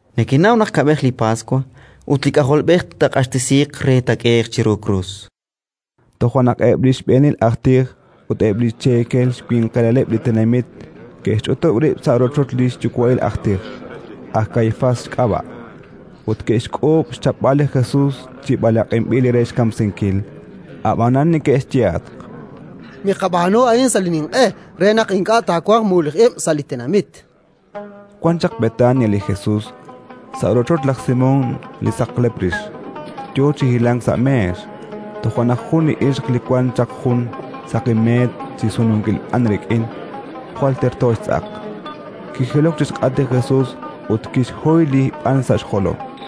—Nekenaw naq kab'ej li Paswa, ut li K'ajolb'ej taaq'axtesiiq re taak'ehe'q chiru krus. Toja' naq eb' li xb'eenil aj tij ut eb' li xcheekel winqilaleb' li tenamit ke'xch'utub' rib' sa' rochoch li xyuwa'il aj tij, aj Kaifás xk'ab'a', ut ke'xk'uub' xchapb'al li Jesus chi b'alaq'inb'il re xkamsinkil. Ab'anan neke'xyehatq: —Miqab'aanu a'an sa' li ninq'e, re naq ink'a' taawanq mululij ib' sa' li tenamit. Wan chaq Betania li Jesus, sa' rochoch laj Simón li saqlep rix, yo chi hilank sa' meex. Toja' naq jun li ixq li wan chaq jun saqi meet chi sununkil b'an rik'in, jwal terto xtz'aq, kijilok chi xk'atq li Jesus ut kixhoy li b'an sa' xjolom.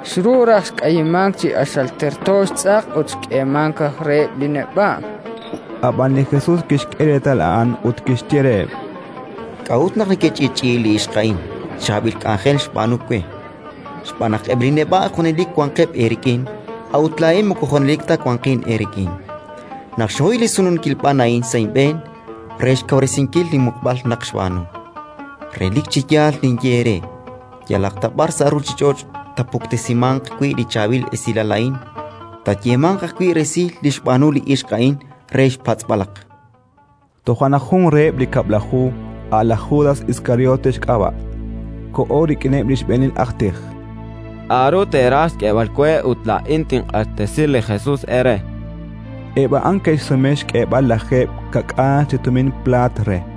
Xru raj xk'ayimank chi q'axal terto xtz'aq ut xk'eemank raj reheb' li neb'a'. Ab'an li Jesus kixk'e reetal a'an ut kixye reheb': —K'a'ut naq nekech'i'ch'i'i li ixq a'in? Chaab'il k'anjel xb'aanu we. Xb'aan naq eb' li neb'a' junelik wanqeb' eerik'in, a'ut laa'in moko junelik ta wanqin eerik'in. Naq xhoy li sununkil b'an a'in sa' inb'een, re xkawresinkil linmuqb'al naq xb'aanu. Relik chi yaal ninye eere: yalaq ta b'ar sa' ruuchich'och' taapuktesimanq wi' li Chaab'il Esilal a'in, taayeemanq ajwi' resil li xb'aanu li ixq a'in re xpatz'b'alaq. Toja' naq jun reheb' li Kab'laju, a' laj Judas Iskariote xk'ab'a', koho rik'ineb' li xb'eenil aj tij: “K'aru teeraj xk'eeb'al we ut laa'in tinq'axtesi li Jesus eere?”, chan reheb'. Eb' a'an ke'xsume xk'eeb'al lajeeb' xka'k'aal chi tumin plaat re.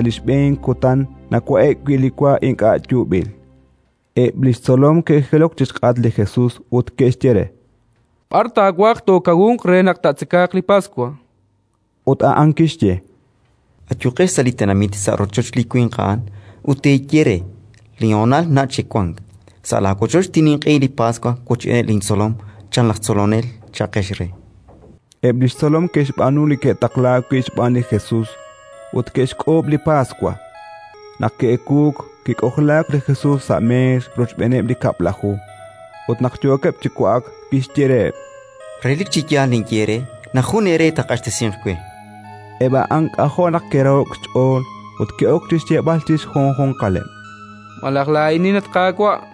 Sa' li xb'een kutan nawa'e'k wi' li wa ink'a' yuub'il, eb' li xtzolom ke'jilok chi xk'atq li Jesus ut ke'xye re: —B'ar taawaj tookawunq re naq taatzeka li Paswa? Ut a'an kixye: —Ayuqex sa' li tenamit, sa' rochoch li winq a'an, ut teeye re: «Linhonal nach' chik wank; sa' laawochoch tinninq'ehi li Paswa wochb'eeneb' lintzolom, chan laj Tzolonel», cha'qex re. Eb' li xtzolom ke'xb'aanu li ke'taqlaak wi' xb'aan li Jesus, ut ke'xk'uub' li Paswa. Naq ki'ewuuk, kik'ojlaak li Jesus sa' meex rochb'eeneb' li Kab'laju. Ut naq yookeb' chi wa'ak, kixye reheb': —Relik chi yaal ninye eere naq jun eere taaq'axtesinq we. Eb' a'an k'ajo' naq ke'raho'k xch'ool ut ke'ok chi xyeeb'al chi xjunjunqaleb': —Malaj laa'inin, at Qaawa'?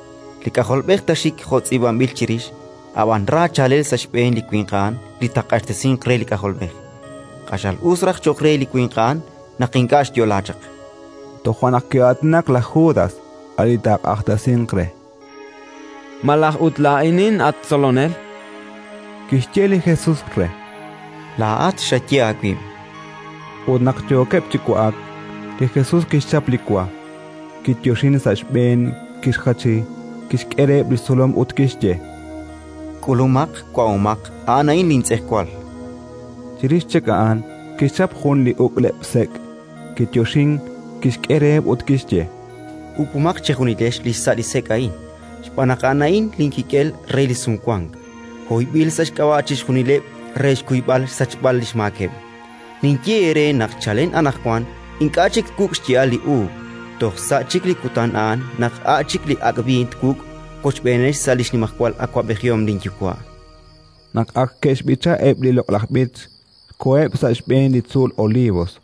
Li K'ajolb'ej taaxik jo' tz'iib'anb'il chirix, ab'an ra chaalel sa' xb'een li winq a'an li taaq'axtesinq re li K'ajolb'ej! Q'axal us raj cho'q re li winq a'an naq ink'a' xyo'laak chaq. Toja' naq ki'aatinak laj Judas, a' li taaq'axtesinq re: —Malaj ut laa'inin, at Tzolonel? chan. Kixye li Jesus re: —Laa'at xaye aawib'. Ut naq yookeb' chi wa'ak, li Jesus kixchap li wa, kiyoxink sa' xb'een, kixjachi, kixk'e reheb' li xtzolom ut kixye: —K'ulumaq, wa'omaq; a'an a'in lintz'ejwal. Chirix chik a'an kixchap jun li uk'leb'-sek', kiyoxink, kixk'e reheb' ut kixye: —Uk'umaq chejunilex li xsa' li sek' a'in. Xb'aan naq a'an a'in linkik'el re li Sumwank, hoyb'il sa' xk'ab'a' chixjunileb' re xkuyb'al xsachb'al li xmaakeb'. Ninye eere naq chalen anaqwan ink'a' chik twuk' xya'al li uub' toj sa' chik li kutan a'an naq a' chik li ak' b'iin twuk' wochb'eenex sa' li xnimajwal awab'ejihom linYuwa'. Naq ak ke'xb'icha eb' li loq'laj b'ich, koheb' sa' xb'een li tzuul Olivos.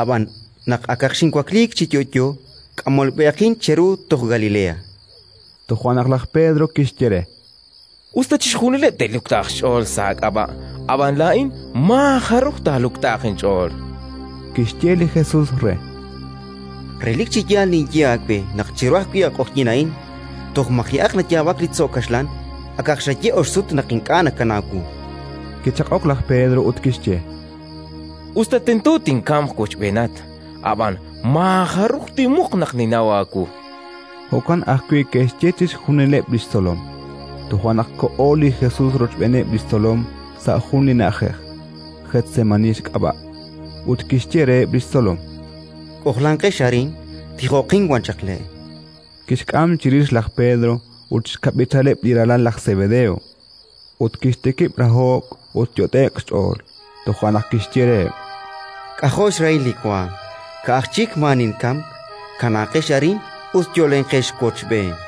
Ab'an, naq akaq xinwakliik chi yo'yo, k'amolb'ehaqin cheru toj Galilea. Toja' naq laj Pedro kixye re: —Us ta chixjunileb' te'luktaaq xch'ool sa' aak'ab'a', ab'an laa'in maa-jaruj taaluktaaq inch'ool. Kixye li Jesus re: —Relik chi yaal ninye aawe naq chiru ajwi' li q'oqyink a'in, toj maji'aq nayaab'ak li tzo' kaxlan, akaq xaye ox sut naq ink'a' nakanaw wu. Kichaq'ok laj Pedro ut kixye: —Us ta tento tinkamq wochb'eenat, ab'an maajaruj tinmuq naq ninnaw aawu. Jo'kan ajwi' ke'xye chixjunileb' li xtzolom. Toja' naq koho li Jesus rochb'eeneb' li xtzolom sa' jun li na'ajej, Getsemaní xk'ab'a'. Ut kixye reheb' li xtzolom: —K'ojlanqex arin, tijoqin wan chaq le'. Kixk'am chirix laj Pedro ut xkab'ichaleb' li ralal laj Sebedeo, ut kixtikib' raho'k ut yot'e'k xch'ool. Toja' naq kixye reheb': —K'ajo' xrahil li waanm, ka'aj chik maa ninkamk! Kanaaqex arin ut yo'lenqex wochb'een.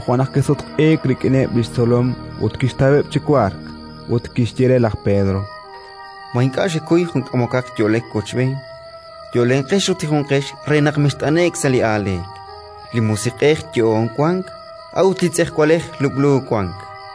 Toja' naq kisutq'iik rik'ineb' li xtzolom ut kixtaweb' chi wark; ut kixye re laj Pedro: —Ma ink'a' xekuy jun k'amokaq yo'lek wochb'een? Yo'lenqex ut tijonqex re naq mext'ane'k sa' li aaleek: li musiq'ej yo'oon wank, a'ut li tz'ejwalej lub'lub' wank.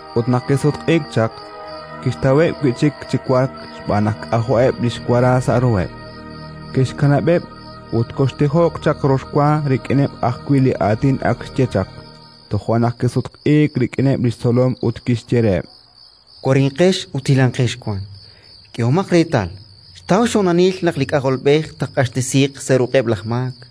Ut naq kisutq'iik chaq, kixtaweb' wi' chik chi wark xb'aan naq k'ajo'eb' li xwara sa' ruheb'. Kixkanab'eb' ut koxtijoq chaq rox wa rik'ineb' ajwi' li aatin ak xye chaq. Toja' naq kisutq'iik rik'ineb' li xtzolom ut kixye reheb': —Warinqex ut hilanqex wan. K'ehomaq reetal, xtaw xhonalil naq li K'ajolb'ej taaq'axtesiiq sa' ruq'eb' laj maak.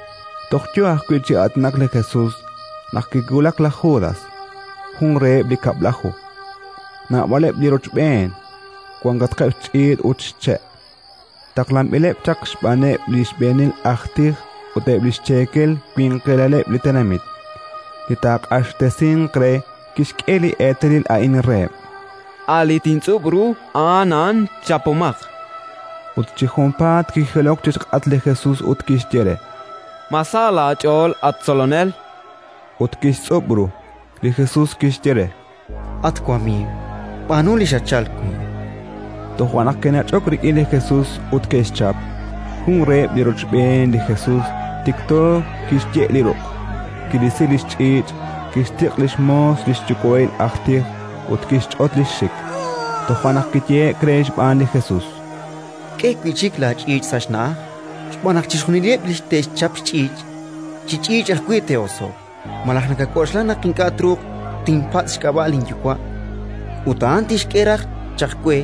Toj yo ajwi' chi aatinak li Jesus, naq kiwulak laj Judas, jun reheb' li Kab'laju. Naab'aleb' li rochb'een, wankatqeb' xch'iich' ut xche', taqlanb'ileb' chaq xb'aaneb' li xb'eenil aj tij ut eb' li xcheekel winqilaleb' li tenamit. Li taaq'axtesinq re kixk'e li eetalil a'in reheb': “A' li tintz'ub' ru, a'an a'an. Chapomaq”. Ut chi junpaat kijilok chi xk'atq li Jesus ut kixye re: —Ma sa laach'ool, at Tzolonel? Ut kixtz'ub' ru. Li Jesus kixye re: —At wamiiw, b'aanu li xatchalk wi'. Toja' naq ke'nach'ok rik'in li Jesus ut ke'xchap. Jun reheb' li rochb'een li Jesus tikto kixye' li ruq', kirisi li xch'iich', kixtiq' li xmoos li xyuwa'il aj tij ut kixch'ot li xxik. Toja' naq kiyehe'k re xb'aan li Jesus: —K'e wi' chik laach'iich' sa' xna'aj, xb'aan naq chixjunileb' li te'xchap xch'iich', chi ch'iich' ajwi' te'oso'q. Malaj nakak'oxla naq ink'a' truuq tinpatz' xk'ab'a' linYuwa', ut a'an tixk'e raj chaq we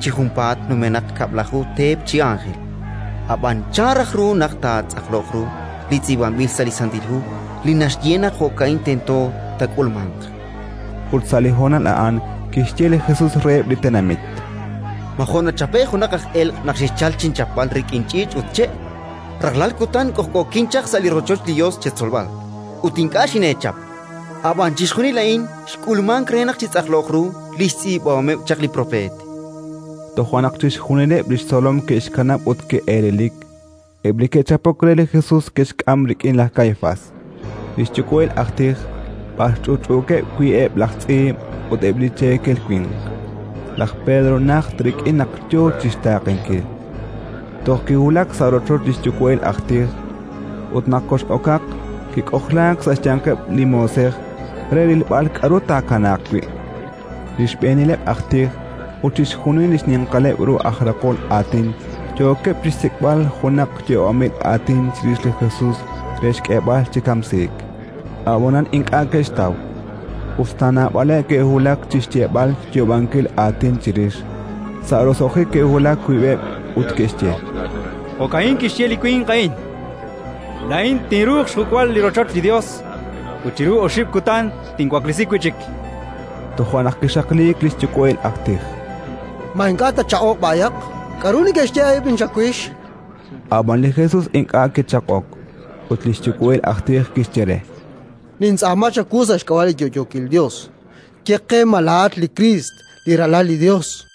chi junpaat numenaq kab'laju teep chi ánjel? Ab'an chan raj ru naq taatz'aqloq ru li tz'iib'anb'il sa' li Santil Hu li naxye naq jo'ka'in tento taak'ulmanq? Ut sa' li honal a'an kixye li Jesus reheb' li tenamit: —Ma jo' nachape'k junaq aj elq' naq xexchalk chinchapb'al rik'in ch'iich' ut che'? Rajlal kutan k'ojk'ookin chaq sa' rochoch li Yos cheetzolb'al, ut ink'a' xineechap. Ab'an chixjunil a'in xk'ulmank re naq chitz'aqloq ru li xtz'iib'ahomeb' chaq li Propeet. Toja' naq chixjunileb' li xtzolom ke'xkanab' ut ke'elelik. Eb' li ke'chapok re li Jesus ke'xk'am rik'in laj Kaifás, li xyuwa'il aj tij, b'ar ch'utch'uukeb' wi' eb' laj tz'iib' ut eb' li cheekel winq. Laj Pedro najt rik'in naq yo chi xtaaqenkil, toj kiwulak sa' rochoch li xyuwa'il aj tij. Ut naq kox'okaq, kik'ojlaak sa' xyanqeb' li moosej re rilb'al k'aru taakanaaq wi'. Li xb'eenileb' aj tij ut chixjunil li xninqaleb' ru aj raqol aatin yookeb' chi xsik'b'al junaq yoob'anb'il aatin chirix li Jesus re xk'eeb'al chi kamsiik; ab'anan ink'a' ke'xtaw, us ta naab'aleb' ke'wulak chi xyeeb'al yoob'anb'il aatin chirix. Sa' roso'jik ke'wulak wiib'eb' ut ke'xye: —Jo'ka'in kixye li winq a'in: «Laa'in tinruuq xjuk'b'al li rochoch li Yos ut chiru oxib' kutan tinwaklesi wi' chik». Toja' naq kixaqliik li xyuwa'il aj tij: —Ma ink'a' tatchaq'oq b'ayaq? K'aru neke'xye eb' a'in chawix? chan re. Ab'an li Jesus ink'a' kichaq'ok. Ut li xyuwa'il aj tij kixye re: —Nintz'aama chawu sa' xk'ab'a' li yo'yookil Yos: ye qe ma laa'at li Kriist, li Ralal li Yos.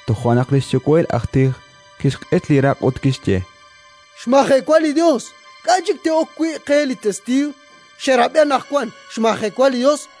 Toja' naq li xyuwa'il aj tij kixq'ich li raq' ut kixye: —Xmajewa li Yos! K'a' chik te'ok wi' qe li testiiw? Xerab'i anaqwan, xmajewa li Yos.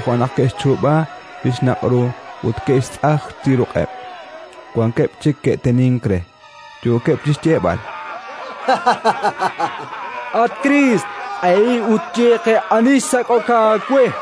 Toja' naq ke'xchuub'a li xnaq' ru ut ke'xtzaj chi ruq'eb'; wankeb' chik ke'tenink re, yookeb' chi xyeeb'al: —At Kriist, q'ehi ut ye qe ani xsak'ok aawe.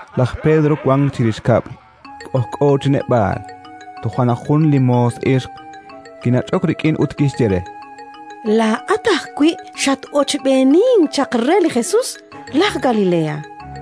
Laj Pedro wank chirix kab'l, k'ojk'o chi neb'aal. Toja' naq jun li moos ixq kinach'ok rik'in ut kixye re: —Laa'at ajwi' xat-ochb'eenink chaq re li Jesus, laj Galilea.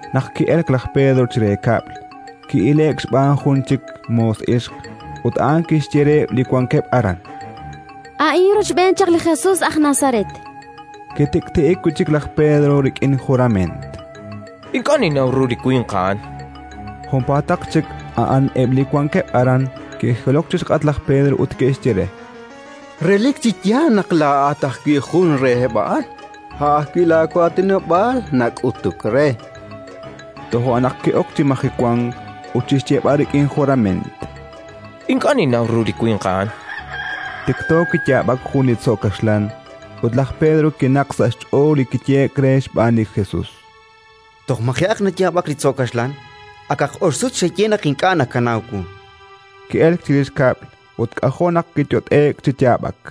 Naq ki'elk laj Pedro chire kab'l, ki'ile'k xb'aan jun chik moos ixq; ut a'an kixye reheb' li wankeb' aran: —A'in rochb'een chaq li Jesus aj Nazaret. Kitik'ti'ik wi' chik laj Pedro rik'in jurament: —Ink'a' ninnaw ru li winq a'an, chan. Junpaataq chik a'an eb' li wankeb' aran ke'jilok chi xk'atq laj Pedro ut ke'xye re: —Relik chi yaal naq laa'at ajwi' jun reheb' a'an! A' ajwi' laawaatinob'aal nak'utuk re. Toja' naq ki'ok chi majewank ut chi xyeeb'al rik'in jurament: —Ink'a' ninnaw ru li winq a'an. Tikto kiyaab'ak jun li tzo' kaxlan. Ut laj Pedro kinaqk sa' xch'ool li kiyehe'k re xb'aan li Jesus: “Toj maji'aq nayaab'ak li tzo' kaxlan, akaq ox sut xaye naq ink'a' nakanaw wu”. Ki'elk chirix kab'l ut k'ajo' naq kiyot'e'k chi yaab'ak.